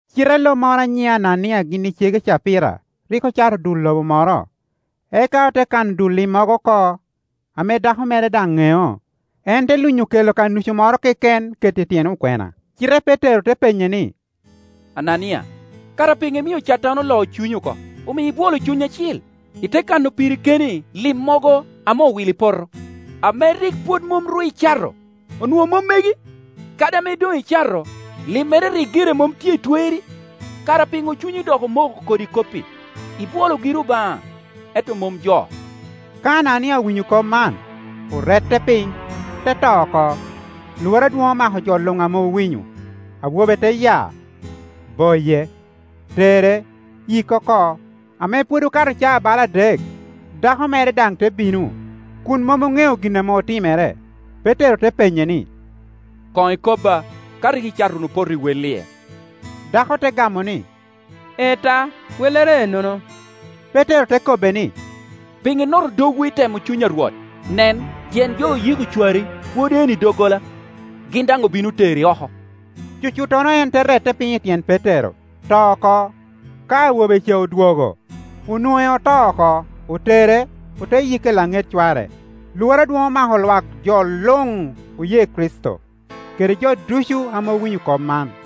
Cite lo moro a nyine Anania gin kede cege Capira rik ocato dul lobo moro, eka ote kano dul limmogo oko, ame dako mere daŋ ŋeo, en te lunyo kela ka nucu moro keken keto i tyen okwena. Cite Petero te penye ni, “Anania, kara piŋo imio Catan oloo cunyi oko, omio ibwolo Cuny Acil, ite kano piri keni limmogo ame owilo i poto? Ame rik pwod mom ru icato, onwoŋo mom megi? Kadi ame doŋ icato, limmere rik gire mom tye i twerri? Kara piŋo cunyi dok omoko kodi kop-pi? Ibwolo giri Obaŋa, ento mom jo.” Ka Anania owinyo kop man, orette piny, te to oko. Lworo adwoŋ omako jo luŋ ame owinyo. Awobe te ya, boye, tere, yike oko. Ame pwod okato caa bala adek, dako mere daŋ te bino, kun mom oŋeo gin ame otimere. Petero te penye ni, “Koŋ ikobba ka rik icato wunu poto i wel-lie?” Dako te gamo ni, “Ee ta, wellere ennono.” Petero te kobbe ni, “Piŋo inoto dogwu i temo Cuny a Rwot? Nen, tyen jo oyiko cwari pwod enno i doggola, gin daŋ obino teri oko.” Cucuttono en te rette piny i tyen Petero, to oko. Ka awo be ca odwogo, onwoŋe oto oko, otere, ote yike i laŋet cware. Lworo adwoŋ omako lwak jo luŋ oye Kricito, kede jo ducu ame owinyo kop man.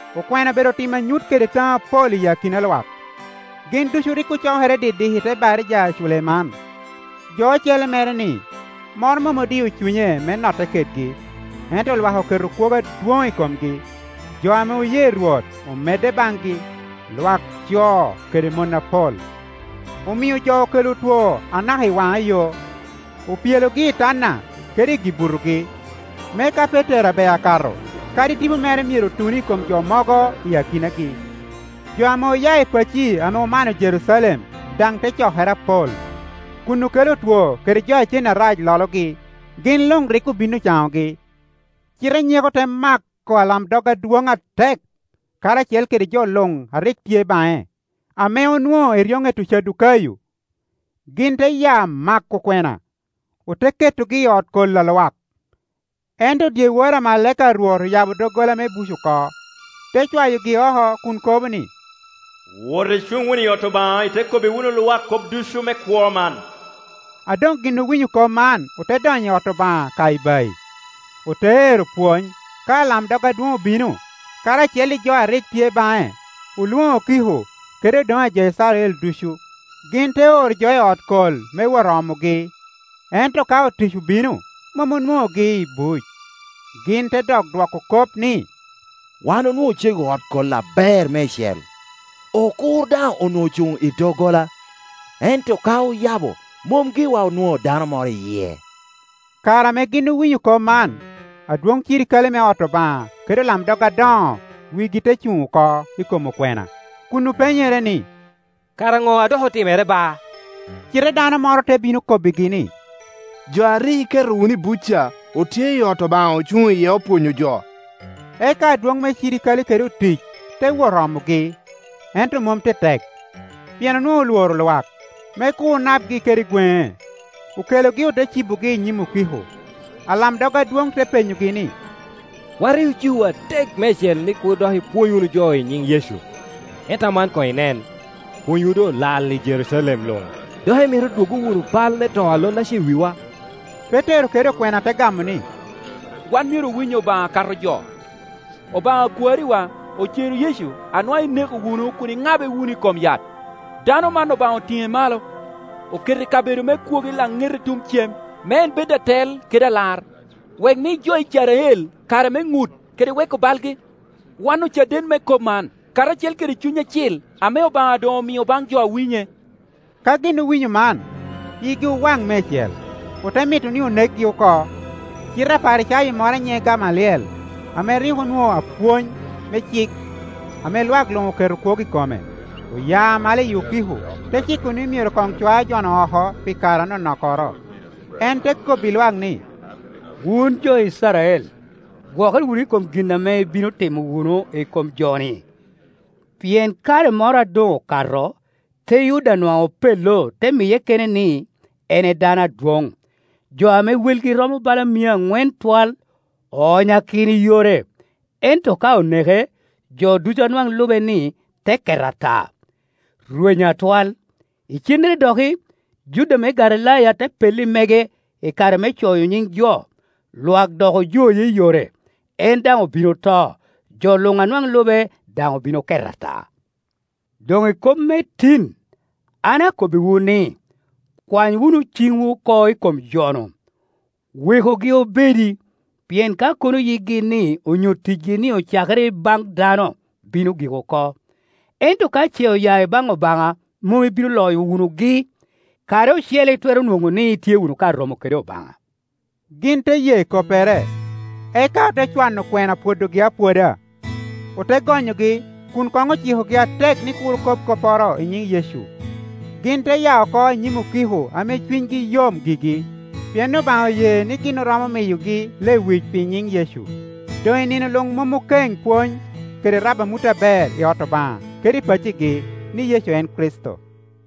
Okwena obedo timo anyut kede taŋo apol i akina lwak. Gin ducu rik ocokere didik i te baraja a Culeman. Jo ocele mere-ni, moro mom odio cunye me notte kedgi, ento lwak oketo kwogo adwoŋ i komgi. Jo ame oye Rwot omedde baŋgi, lwak co kede mon apol. Omio jo okelo otwo anaka i waŋa yo, opyelogi i tanda kede gi-butogi, me ka Petero abeo akato, kadi tipo mere myero tun i kom jo mogo i akinagi. Jo ame oya i pacci ame omano Jerucalem daŋ te cokere apol, kun okelo otwo kede jo a cen arac lologi, gin luŋ rik obin ocaŋogi. Cite nyeko te mako alamdog adwoŋ atek, karacel kede jo luŋ a rik tye baŋe, ame onwoŋo eryoŋet Ocadukayo. Gin te ya mako okwena, ote ketogi i ot kol a lwak. Ento dyewor amalaika a Rwot oyabo doggola me buc oko, te cwayogi oko kun kobo ni, “Wot icuŋ wunu i ot Obaŋa, ite kobbi wunu lwak kop ducu me Kwo man.” A doŋgin owinyo kop man ote donyo i ot Obaŋa ka ibayi, ote ero pwony. Ka alamdog adwoŋ obino, karacel i jo a rik tye baŋe, olwoŋo okiko, kede odoŋe a jo Icrael ducu, gin te oro jo i ot kol me wot omogi. Ento ka otic obino, mom ownonogi i buc; gin te dok dwoko kop ni, “Wan onwoŋo ocego ot kol aber meicel, okur daŋ onwoŋo ocuŋ i doggola, ento ka oyabo, mom giwa onwoŋo dano moro i yie.” Kare ame gin owinyo kop man, adwoŋ cirikale me ot Obaŋa kede olamdog adoŋo wigi te cuŋ oko i kom okwena, kun openyere ni, “Kara Ŋo a dok otimere ba?” Cite dano moro te bino kobbigi ni, “lo a rik iketo wunu i buc ca, otye i ot Obaŋa ocuŋ iye opwonyo jo.” Eka adwoŋ me cirikale kede otic te wot omogi, ento mom tetek, pien onwoŋo olworo lwak, me kur napgi kede gweŋe. Okelogi ote cibogi i nyim okiko, alamdog adwoŋ te penyogi ni, “Wan rik ocikowu atek meicel ni kur dok ipwony wunu jo i nyiŋ Yecu, ento aman koŋ inen, pwonywu doŋolal i Jerucalem luŋ, dok imito dwoggo wunu bal me to a lon-naca i wiwa!” Petero kede okwena te gamo ni, “Wan myero owiny Obaŋa akato jo. Obaŋa a kwariwa ocero Yecu a nwaŋ ineko wunu kun iŋabe wunu i kom yat. Dano man Obaŋa otiŋe malo, okete i kabedo me kwogo i laŋete tuŋ cem me en bed Atel kede Alar, wek mi jo Icrael kare me ŋut kede weko balgi. Wan ocaden me kop man, karacel kede Cuny Acil ame Obaŋa doŋomio baŋ jo a winye.” Ka gin owinyo man, yigi owaŋ meicel, ote mito ni onekgi oko. Cite Aparicayo moro a nyiŋe Gamaliel, ame rik onwoŋo apwony me cik ame lwak luŋ keto kwogo i kome, oya malo i okiko, te ciko ni myero koŋ cwa jo-nu oko pi kare anonokkoro. En te kobbi lwak ni, “Wun jo Icrael, gwokere wunu i kom gin ame ibino timo wunu i kom jo-ni. Pien kare moro a doŋokato, Teyuda nwaŋ opello te miye kene ni en edano adwoŋ, jo ame welgi romo bala mia aŋwen twal oonyakino i yore. Ento ka oneke, jo ducu a nwaŋ lube-ni te ket ata, rwenyo atwal. Icennere doki, Juda me Galilaya te pello i mege i kare me coyo nyiŋ jo, lwak dok ojoye i yore; en daŋ obin oto, jo luŋ a nwaŋ lube daŋ obin oket ata. Doŋ i kop me tin, an akobbiwu ni, kwany wunu ciŋwu oko i kom jo-nu, wekugi obedi; pien ka kono yikgi-ni onyo ticgi-ni ocakere i baŋ dano, bino gik oko. Ento ka ce oya i baŋ Obaŋa mom ibino loyo wunugi; kare ocele itwero nwoŋo ni itye wunu ka romo kede Obaŋa.” Gin te ye koppere, eka ote cwano okwena pwodogi apwoda, ote gonyogi kun koŋ ocikogi atek ni kur okob kopporo i nyiŋ Yecu. Gin te ya oko i nyim okiko ame cunygi yom gigi, pien Obaŋa oye ni gin oromo miyogi lewic pi nyin Yecu. Doŋ i nino luŋ mom okeŋ pwony kede rabo amut aber i ot Obaŋa kede i paccigi ni Yecu en Kricito.